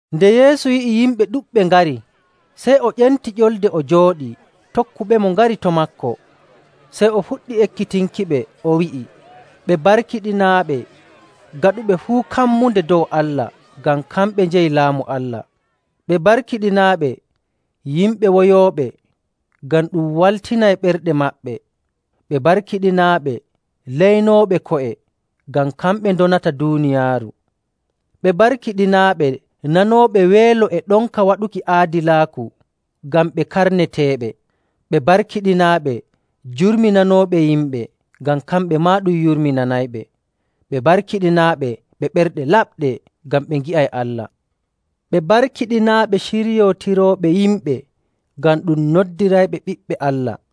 Nde Yeesu yi'i yimɓe ɗuɗɓe ngari, sey o ƴenti ƴolde o jooɗi, tokkuɓemo ngari to maako. Sey o fuɗɗi ekkitinkiɓe, o wi'i, “Ɓe barkiɗinaaɓe gaɗuɓe fuu kammunde dow Allah, ngam kamɓe njeyi Laamu Allah. “Ɓe barkiɗinaaɓe yimɓe woyooɓe, ngam ɗum waltinay ɓerɗe maɓɓe.. “Ɓe barkiɗinaaɓe leynooɓe ko'e, ngam kamɓe ndonata duuniyaaru.. “Ɓe barkiɗinaaɓe nanooɓe weelo e ɗonka waɗuki aadilaaku, ngam ɓe karneteeɓe.. “Ɓe barkiɗinaaɓe jurminanooɓe yimɓe, ngam kamɓe maa ɗum yurminanayɓe. “Ɓe barkiɗinaaɓe ɓe ɓerɗe laɓɗe, ngam ɓe ngi'ay Allah.. “Ɓe barkiɗinaaɓe ciryootirooɓe yimɓe, ngam ɗum noddirayɓe ɓiɓɓe Allah.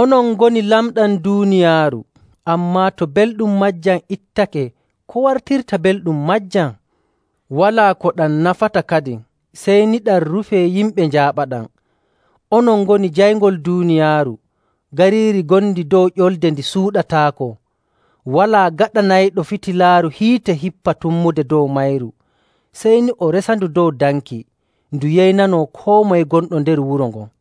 “Onon ngoni lamɗam duuniyaaru. Ammaa to belɗum maajam ittake, ko wartirta belɗum maajam? Walaa ko ɗam nafata kadin, sey ni ɗam rufee yimɓe njaaɓaɗam.. “Onon ngoni jayngol duuniyaaru. Gariiri ngondi dow ƴolde ndi suuɗataako.. Walaa gaɗanayɗo fitilaaru hiite hippa tummude dow mayru. Sey ni o resandu dow danki, ndu yeynanoo koo moye gonɗo nder wuro ngon..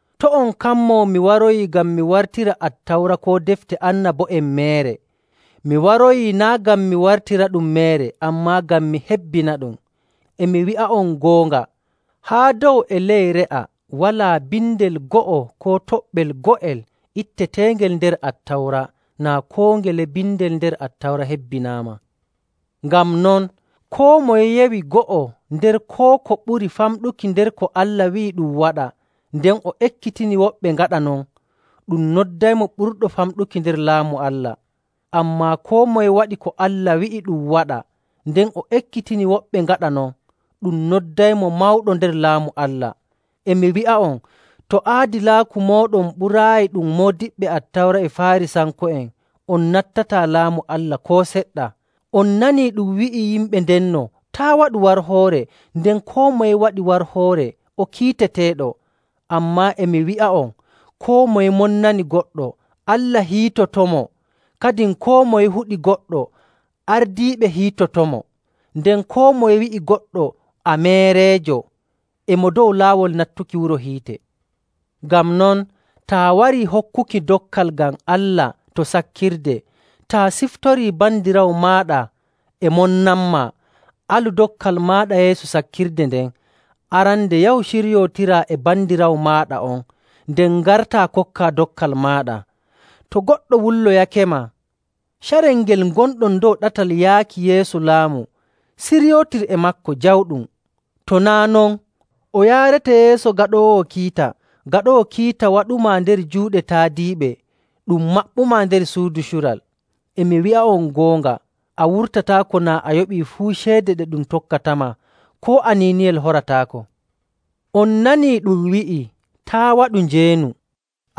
“To' on kammo mi waroyi ngam mi wartira Attawra koo Defte Annabo'en meere. Mi waroyi naa' ngam mi wartiraɗum meere, ammaa ngam mi hebbinaɗum. E mi wi'a'on goonga, haa dow e ley re'a, walaa bindel go'o koo toɓɓel go'el itteteengel nder Attawra naa koo ngele bindel nder Attawra hebbinaama.. Ngam non, koo moye yewi go'o nder koo ko ɓuri famɗuki nder ko Allah wi'i ɗum waɗa, nden o ekkitini woɓɓe ngaɗa non, ɗum noddaymo ɓurɗo famɗuki nder Laamu Allah. Ammaa koo moye waɗi ko Allah wi'i ɗum waɗa, nden o ekkitini woɓɓe ngaɗa non, ɗum noddaymo mawɗo nder Laamu Allah. E mi wi'a'on, to aadilaaku mooɗon ɓuraayi ɗum moodiɓɓe Attawra e Faarisanko'en, on nattataa Laamu Allah koo seɗɗa! “On nani ɗum wi'i yimɓe ndenno, ‘Taa' waɗu warhoore,’ nden ‘koo moye waɗi warhoore o kiiteteeɗo.’. Ammaa e mi wi'a'on, koo moye monnani goɗɗo, Allah hiitotomo. Kadin koo moye huɗi goɗɗo, ardiiɓe hiitotomo. Nden koo moye wi'i goɗɗo ‘A meereejo!’ e mo dow laawol nattuki wuro hiite. Ngam non, taa warii hokkuki dokkal ngam Allah to sakkirde, taa siftorii bandiraawo maaɗa e monnanmaa, alu dokkal maaɗa yeeso sakkirde nden, arande yahu ciryootiraa e bandiraawo maaɗa on, nden ngartaa kokkaa dokkal maaɗa. “To goɗɗo wulloyakema, carel ngel ngonɗon dow ɗatal yaaki yeeso laamu siryootir e maako jawɗum. To naa' non, o yaarete yeeso gaɗoowo kiita, gaɗoowo kiita waɗumaa nder juuɗe taadiiɓe, ɗum maɓɓumaa nder suudu cural. E mi wi'a'on goonga, a wurtataako naa a yoɓii fuu ceede ɗe ɗum tokkatama koo aniiniyel horataako. “On nani ɗum wi'ii, ‘Taa' waɗu njeenu.’.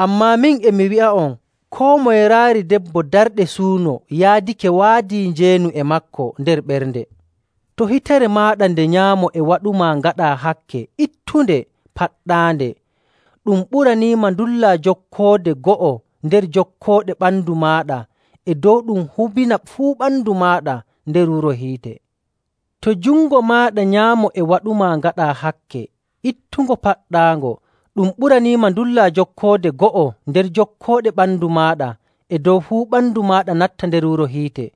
Ammaa min, e mi wi'a'on koo moye raari debbo darɗe suuno yaadake waadii njeenu e maako nder ɓernde. To hitere maaɗa nde nyaamo e waɗumaa ngaɗaa hakke, ittunde, paɗɗaande. Ɗum ɓuraniima ndullaa jokkoode go'o nder jokkooɗe ɓandu maaɗa e dow ɗum hubina fuu ɓandu maaɗa nder wuro hiite.. To jungo maaɗa nyaamo e waɗumaa ngaɗaa hakke, ittungo, paɗɗaango. Ɗum ɓuraniima ndullaa jokkoode go'o nder jokkooɗe ɓandu maaɗa e dow fuu ɓandu maaɗa natta nder wuro hiite..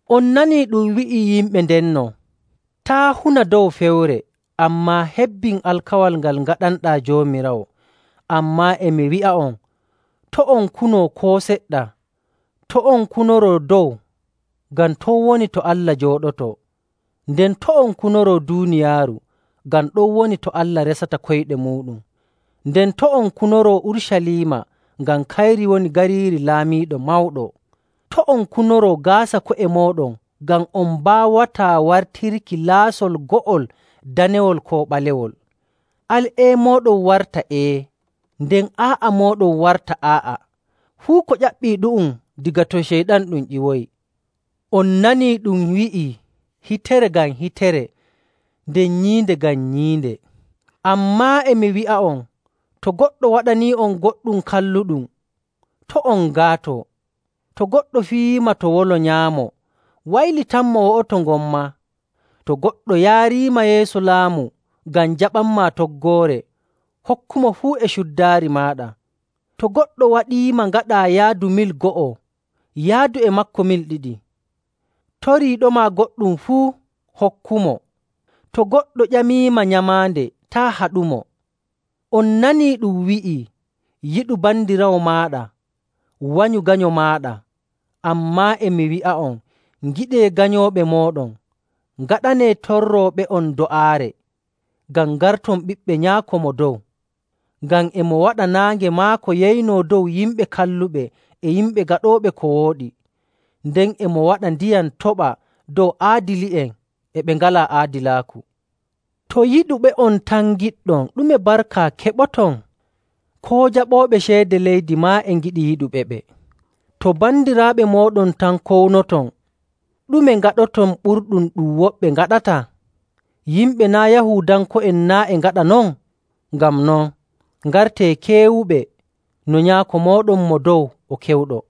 “On nanii ɗum wi'ii yimɓe ndenno, ‘Taa' huna dow fewre, ammaa hebbin alkawal ngal ngaɗanɗaa Joomiraawo.’. Ammaa e mi wi'a'on, to' on kuno koo seɗɗa. To' on kunoro dow, ngam ton woni to Allah jooɗoto.. Nden to' on kunoro duuniyaaru, ngam ɗon woni to Allah resata koyɗe muuɗum. Nden to' on kunoro Urucaliima ngam kayri woni gariiri Laamiiɗo Mawɗo.. To' on kunoro gaasa ko'e mooɗon, ngam on mbaawataa wartirki laasol go'otol danewol koo ɓalewol. Al ‘Ee’ mooɗon warta ‘Ee,’ nden ‘Aa'a’ mooɗon warta ‘Aa'a.’ Fuu ko ƴaɓɓii ɗu'um, daga to Ceyɗan ɗum ƴiwoyi. “On nani ɗum wi'ii, ‘Hitere ngam hitere, nden nyiinde ngam nyiinde.’. Ammaa e mi wi'a'on, to goɗɗo waɗanii'on goɗɗum kalluɗum, to' on ngaato. To goɗɗo fiyiima to wolo nyaamo, waylitanmo wo'oto ngon maa. To goɗɗo yaariima yeeso laamu ngam jaɓanmaa toggoore, hokkumo fuu e cuddaari maaɗa. To goɗɗo waɗiima ngaɗaa yaadu mil go'o, yaadu e maako mil ɗiɗi. Toriiɗoma goɗɗum fuu, hokkumo. To goɗɗo ƴamiima nyamaande, taa' haɗumo. “On nanii ɗum wi'ii, ‘Yiɗu bandiraawo maaɗa, wanyu ganyo maaɗa.’ Ammaa e mi wi'a'on, ngiɗee ganyooɓe mooɗon, ngaɗanee torrooɓe'on do'aare, ngam ngarton ɓiɓɓe Nyaako Mo Dow. Ngam e mo waɗa naange maako yeynoo dow yimɓe kalluɓe e yimɓe gaɗooɓe ko wooɗi, nden e mo waɗa ndiyam toɓa dow aadili'en e ɓe ngalaa aadilaaku. To yiɗuɓe'on tan ngiɗɗon, ɗume barka keɓoton? Koo jaɓooɓe ceede leydi maa e ngiɗi yiɗuɓeɓe. To bandiraaɓe mooɗon tan kownoton, ɗume ngaɗoton ɓurɗum ɗum woɓɓe ngaɗata? Yimɓe naa' Yahuudanko'en naa' e ngaɗa non? Ngam non, ngartee keewuɓe no Nyaako mooɗon Mo Dow o kewɗo..